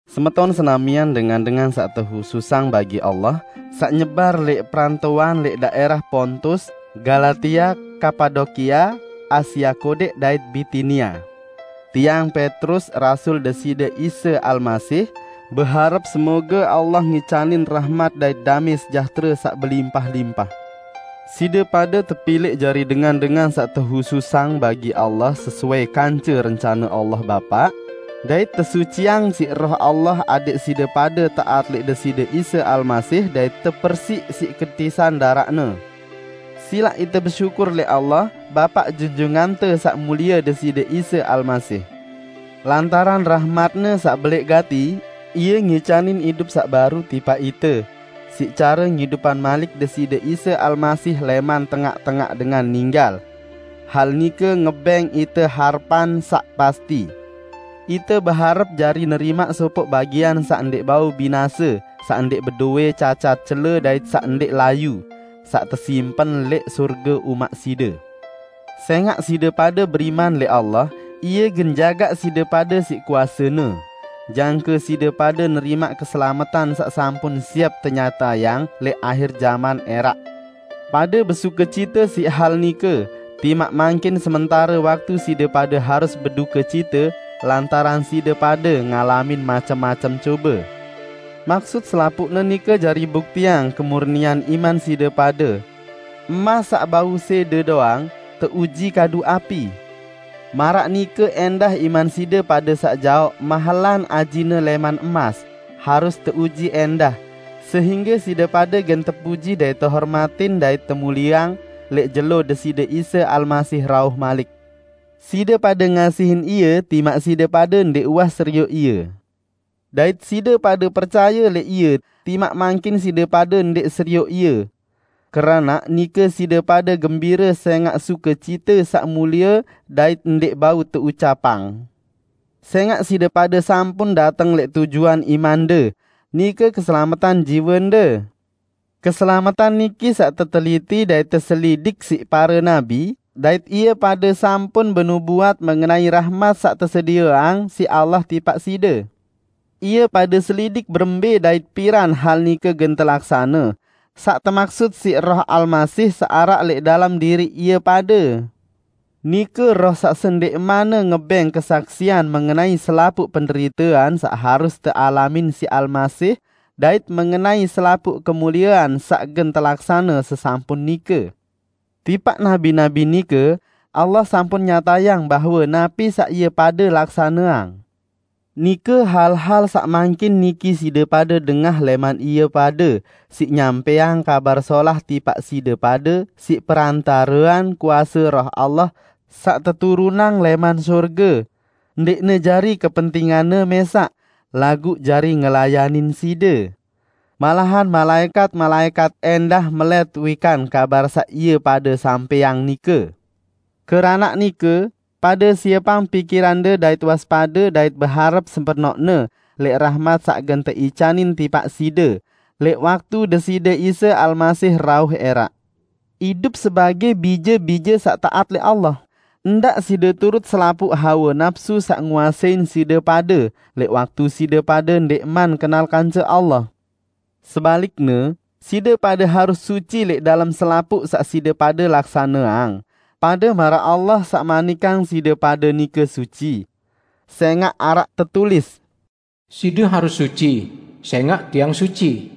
Semeton senamian dengan-dengan saq tehususang bagi Allah, saq nyebar lẽq perantoan lẽq daẽrah Pontus, Galatia, Kapadokia, Asia Kodẽq dait Bitinia! Tiang, Petrus, rasul Deside Isa Almasih, beharep semoge Allah ngicanin rahmat dait damẽ sejahtere saq belimpah-limpah. Side pade tepilẽq jari dengan-dengan saq tehususang bagi Allah sesuai kance rencane Allah Bapa, dait tesuciang siq Roh Allah adẽq side pade taat lẽq Deside Isa Almasih dait tepersiq siq ketisan daraq-Ne. Silaq ite besyukur lẽq Allah, Bapa Junjungante Saq Mulie Deside Isa Almasih! Lantaran rahmat-Ne saq belẽq gati, Ie ngicanin idup saq baru tipaq ite, siq care ngidupang malik Deside Isa Almasih lẽman tengaq-tengaq dengan ninggal. Hal nike ngebẽng ite harepan saq pasti. Ite beharep jari nerimaq sopoq bagian saq ndẽq bau binase saq ndẽq bedowẽ cacat cele dait saq ndẽq layu, saq tesimpen lẽq sorge umaq side. Sẽngaq side pade beriman lẽq Allah, Ie gen jagaq side pade siq kuase-Ne, jangke side pade nerimaq keselametan saq sampun siep tenyatayang lẽq ahir jaman ẽraq. Pade besukecite siq hal nike, timaq mangkin sementare waktu side pade harus bedukecite lantaran side pade ngalamin macem-macem cobe. Maksut selapuqne nike jari buktiang kemurnian iman side pade. Emas saq bau sẽde doang, teuji kadu api. Maraq nike ẽndah iman side pade saq jaoq mahelan ajine lẽman emas, harus teuji ẽndah, sehingge side pade gen tepuji dait tehormatin dait temulieang lẽq jelo Deside Isa Almasih rauh malik. Side pade ngasihin Ie, timaq side pade ndẽq uwah serioq Ie. Dait side pade percaye lẽq Ie timaq mangkin side pade ndẽq serioq Ie. Keranaq nike side pade gembire sẽngaq sukecite saq mulie dait ndẽq bau teucapang. Sẽngaq side pade sampun dateng lẽq tujuan imande, nike keselametan jiwende. Keselametan niki saq teteliti dait teselidik siq pare nabi, dait ie pade sampun benubuat mengenai rahmat saq tesedieang siq Allah tipaq side. Ie pade selidik berembẽ dait piran hal nike gen telaksane, saq temaksut siq Roh Almasih saq araq lẽq dalem diriq ie pade, nike Roh saq sendẽqmanne ngebẽng kesaksian mengenai selapuq penderitean saq harus tealamin siq Almasih dait mengenai selapuq kemuliean saq gen telaksane sesampun nike. Tipaq nabi-nabi nike, Allah sampun nyatayang bahwe napi saq ie pade laksaneang -- nike hal-hal saq mangkin niki side pade dengah lẽman ie pade siq nyampẽang Kabar Solah tipaq side pade siq perantarean kuase Roh Allah saq teturunang lẽman sorge -- ndẽqne jari kepentinganne mẽsaq, laguq jari ngelayanin side. Malahan malaẽkat-malaẽkat ẽndah melẽt wikan kabar saq ie pade sampẽang nike. Keranaq nike, pade siepang pikirande dait waspade dait beharep sepenoqne lẽq rahmat saq gen teicanin tipaq side lẽq waktu Deside Isa Almasih rauh ẽraq. Idup sebagẽ bije-bije saq taat lẽq Allah. Ndaq side turut selapuq hawe napsu saq nguasein side pade lẽq waktu side pade ndẽqman kenal kance Allah. Sebalikne, side pade harus suci lẽq dalem selapuq saq side pade laksaneang, pade maraq Allah saq manikang side pade nike suci. Sẽngaq araq tetulis, "Side harus suci, sẽngaq Tiang suci."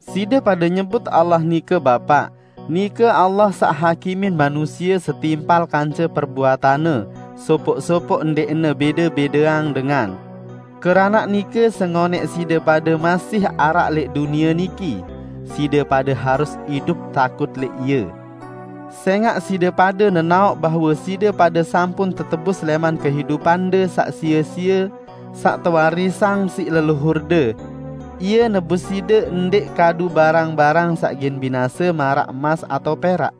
Side pade nyebut Allah nike Bapa, nike Allah saq hakimin manusie setimpal kance perbuatanne sopoq-sopoq ndẽqne bẽde-bẽdeang dengan. Keranaq nike sengonẽq side pade masih araq lẽq dunie niki, side pade harus idup takut lẽq Ie. Sẽngaq side pade nenaoq bahwe side pade sampun tetebus lẽman kehidupande saq sie-sie saq tewarisang siq leluhurde. Ie nebus side ndẽq kadu barang-barang saq gen binase maraq emas atao perak,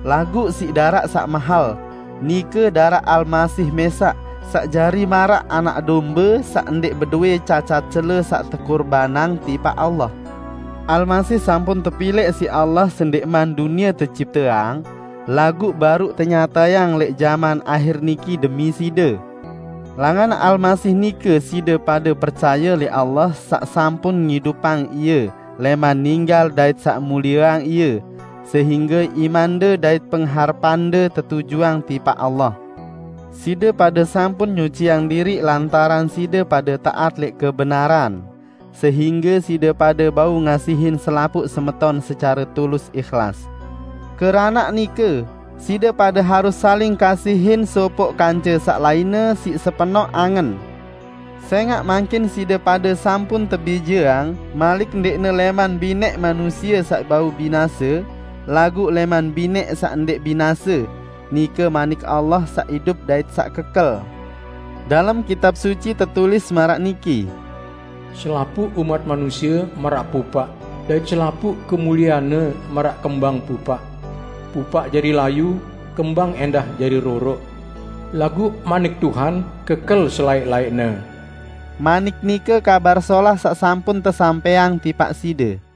laguq siq daraq saq mahel, nike daraq Almasih mẽsaq, saq jari maraq anak dombe saq ndẽq bedowẽ cacat cele saq tekurbanang tipaq Allah. Almasih sampun tepilẽq siq Allah sendẽqman dunie tecipteang, laguq baruq tenyatayang lẽq jaman ahir niki demi side. Langan Almasih nike side pade percaye lẽq Allah saq sampun ngidupang Ie lẽman ninggal dait saq mulieang Ie, sehingge imande dait pengharepande tetujuang tipaq Allah. Side pade sampun nyuciang diriq lantaran side pade taat lẽq kebenaran, sehingge side pade bau ngasihin selapuq semeton secare tulus ihlas. Keranaq nike, side pade harus saling kasihin sopoq kance saq lainne siq sepenoq angen. Sẽngaq mangkin side pade sampun tebijeang malik ndẽqne lẽman binẽq manusie saq bau binase, laguq lẽman binẽq saq ndẽq binase, nike Manik Allah saq idup dait saq kekel. Dalem Kitab Suci tetulis maraq niki, "Selapuq umat manusie maraq pupaq, dait selapuq kemulieanne maraq kembang pupaq. Pupaq jari layu, kembang ẽndah jari roroq, laguq manik Tuhan kekel selaẽq-laẽqne." Manik nike Kabar Solah saq sampun tesampẽang tipaq side.